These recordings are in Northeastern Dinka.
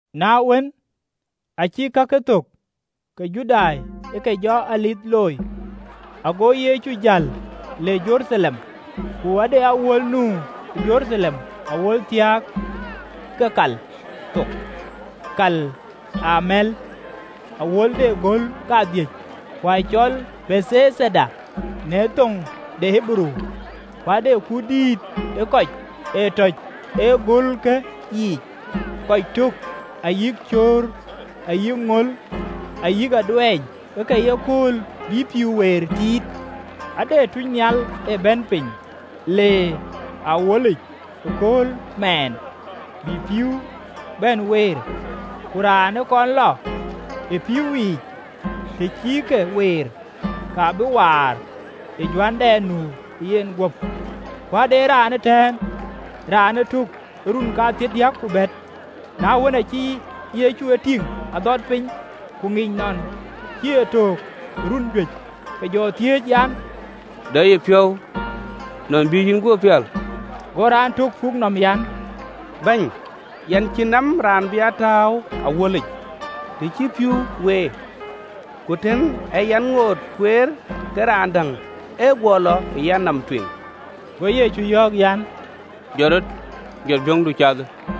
Na wën, acï kakë thök, ke Judai ë ke jɔ Dhuëëŋ looi, ago Yecu jäl le Jeruthalem. Ku ade awuöl nu Jeruthalem awuöl thiääk ke kal thok Kal ë Amɛ̈l, awuöl de göl kadhïc, ku acɔl Bethaida në thoŋ de Ɣeberuu. Ku ade kut dïït ë kɔc ë tɔ̈c ë gölke yiic, kɔc tök, cöör, ayï ŋöl ayï aduɛɛny, ke ke ye kööl bï pïïu weer tiit. Ade tunynhial ë Bɛ̈nydït ee bɛ̈n piny le ë awuölic ëkööl mɛɛn, bï pïïu bɛ̈n weer: ku raan ë kɔn lɔ ë pïïu yiic, të cï ke weer, ka bï waar ë juändɛn nu ë yeguöp. Ku ade raan ëtɛ̈ɛ̈n, raan ë töök ë run kathiërdiäk ku bɛ̈t. Na wën, acï Yecu e tïŋ adhɔt piny, ku ŋic nɔn cï e töök ë run juëc, ke jɔ thiëëc an, “De yï piɔ̈u nɔn bï yïn guöp pial?” Go raan tök puk nɔm, an, “Bɛ̈ny, yɛn cïn nɔm raan bï a tääu ë awuölic, të cï pïïu weer: ku tën aa yɛn ŋoot kueer, ke raan däŋ ee guɔ lɔ ë yanɔm tueŋ.” Go Yecu yɔ̈ɔ̈k an, “Jɔt rɔt, jɔt biöŋdu, cathë.”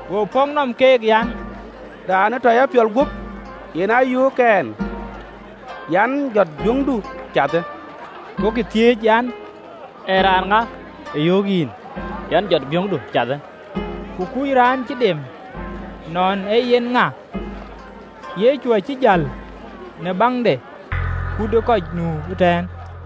Go pɔ̈k nɔm keek an, “Raan ë tɔ ya piɔl, yen aa yöök ɛn an, jɔt biöŋdu, cathë.” Gokï thiëëc an, “Ee raan ŋa ë yöök yïn an, jɔt biöŋdu, cathë?” Ku kuc raan cï dem nɔn ee yen ŋa: Yecu acï jäl, në baŋ de kut ë kɔc nu ëtɛ̈ɛ̈n.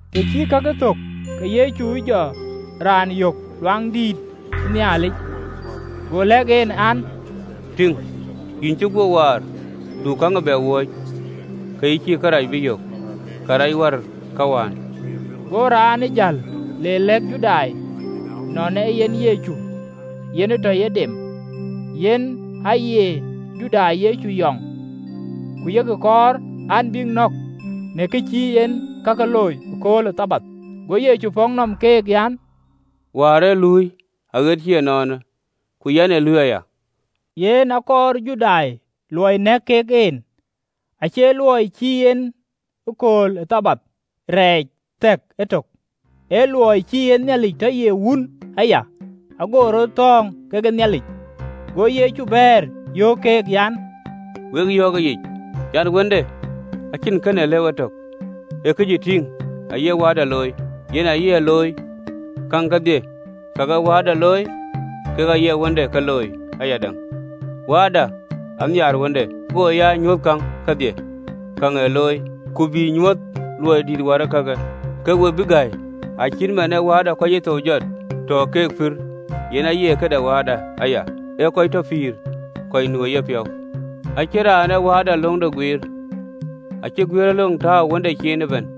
Të cï kakë thök, ke Yecu jɔ raanë yök ë Luaŋdïtic, go lɛ̈k en an, “Tïŋ, yïn cï guöp waar: du käŋ ee bɛ wööc, ke yï cïï kërac bï yök kërɛɛc wär këwään.” Go raanë jäl le lɛ̈k Judai nɔn ee yen Yecu, yen ë tɔ yen dem. Yen aaye Judai Yecu yɔŋ, ku yek kɔɔr an, bïk nɔ̈k, në kë cï en kakë looi ëkööl ë Thabath. Go Yecu pɔ̈k nɔm keek an, “Wäär ee luui aɣet cï ënɔɔnë, ku yɛn ee luui aya.” Yen akɔɔr Judai luɔi nɛ̈k kek en, acie luɔi cï en kööl ë Thabath rɛɛc theek etök, ee luɔi cï en Nhialic tɔ ye Wun aya, ago rɔt thɔ̈ɔ̈ŋ kekë Nhialic. Go Yecu bɛ̈ɛ̈r, yöök keek an, “Wek yɔ̈ɔ̈k ëyic, an, Wënde acïn kën ee lëu etök, ee kë cï tïŋ aye Wääda looi, yen aye looi: käŋ kedhie kak ee Wääda looi, kek aye Wënde ke looi ayadäŋ. Wääda anhiaar Wënde, go ya nyuöth käŋ kedhie kak ee looi: ku bï nyuöth luɔi dïït wär ee kakë, ke we bï gäi. Acït man ee Wääda kɔc cï thou jɔt, tɔ keek pïïr, yen aye këde Wënde aya, ee kɔc tɔ pïïr kɔc nu ë yenpiɔ̈u. Acïn raan ee Wääda löŋde guiir, acï guiëërëlöŋ tääu ë Wënde ciin ëbɛ̈n.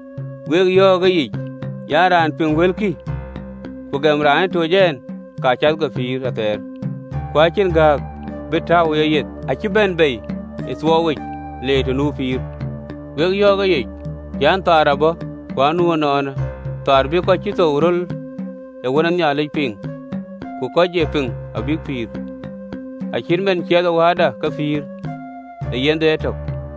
“Wek yɔ̈ɔ̈k ëyic an, Raan piŋ wëlkï, ku gɛm raan ë toc ɛn, ka cath ke pïïr athɛɛr, ku acïn gääk bï tääu ë yeyeth, acï bɛ̈n bei ë thuɔɔuwic, le të nu pïïr. Wek yɔ̈ɔ̈k ëyic an, kööl abɔ̈, ku anu ënɔɔnë, kööl bï kɔc cï thou röl ë Wën ë Nhialic piŋ, ku kɔc ë pïŋ abïk pïïr. Acït man ciɛthë Wääda ke pïïr ë yenhde etök.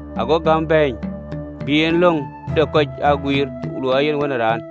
Ago Wëde gäm bɛ̈ɛ̈ny bï en löŋ de kɔc aa guiir, luɔi ee yen Wën ë Raan.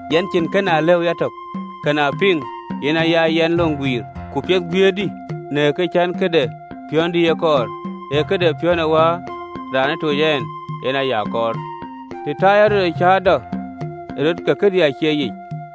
Yɛn cïn kën aa lëu yatök: kën aa piŋ, yen aya yɛn löŋ guiir: ku piɛth guiëërdï, në kë cän këde piɔ̈ndï ee kɔɔr, ee këde piɔ̈n ë Wäär, raan ë toc ɛn, yen aya kɔɔr. Të ta yɛn rɔt ee cäätɔ ë rɔt, ke këdï acie yic.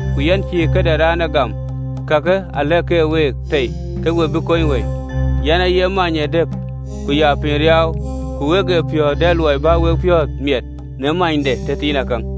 Ku yɛn cïï këde raan ee gam: kakë alɛ̈k ke week tei, ke we bï kony wëi. Yen aaye many ë dɛ̈p ku ye piny riaau: ku wek ë piɔ̈ɔ̈th dɛ luɔi bä wek piɔ̈ɔ̈th miɛt në maanyde tëthiinakäŋ.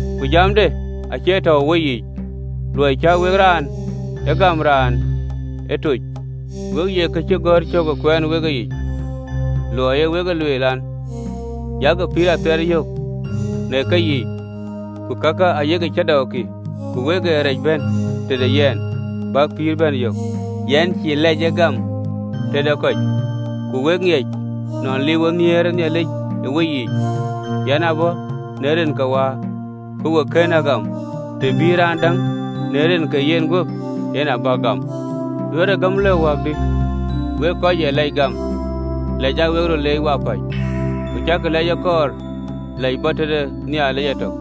ku jamde acie tɔ̈u ë weyiic: luɔi cä wek raan ee gam, raan ë tooc. We ye kacïgɔ̈ɔ̈r cök ë kuɛɛn wek keyiic, luɔi aa wek e lueel an, yak pïïr athɛɛr yök në keyiic, ku kakë ayek cäätɔɔkï, ku wek ee rɛɛc bɛ̈n tëde yɛn, bäk pïïr bɛ̈n yök. “Yɛn cïï lɛc ee gam tëde kɔc. Ku wek ŋiɛc, nɔn liiuwë nhiëër ë Nhialic ë weyiic. Yɛn ë bɔ̈ në rin ke Wäär, ku we kën a gam: të bï raan däŋ në rin ke yenguöp, yen abäk gam. Duɛ̈ɛ̈rkï gäm lëu wäkdï, wek kɔc ë lɛc gam lɛc aa wek röt leec wapäc, ku cäkï lɛc ee kɔɔr lɛc bɔ̈ tëde Nhialic etök?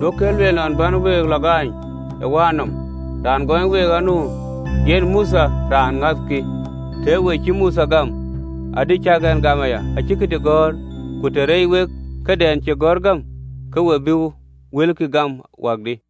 Duökï ee lueel nɔn bän we lɔ gaany ë Wäär nɔm: raan gɔɔny week anu, yen Mothe raan ŋäthkï. Tëë we cï Mothe gam, adï cäk ɛn gam aya: acï këdï gɔ̈ɔ̈r. Ku të rɛɛc wek kakɛn cï gɔ̈ɔ̈r gam, ke we bï wëlkï gam wäkdï?”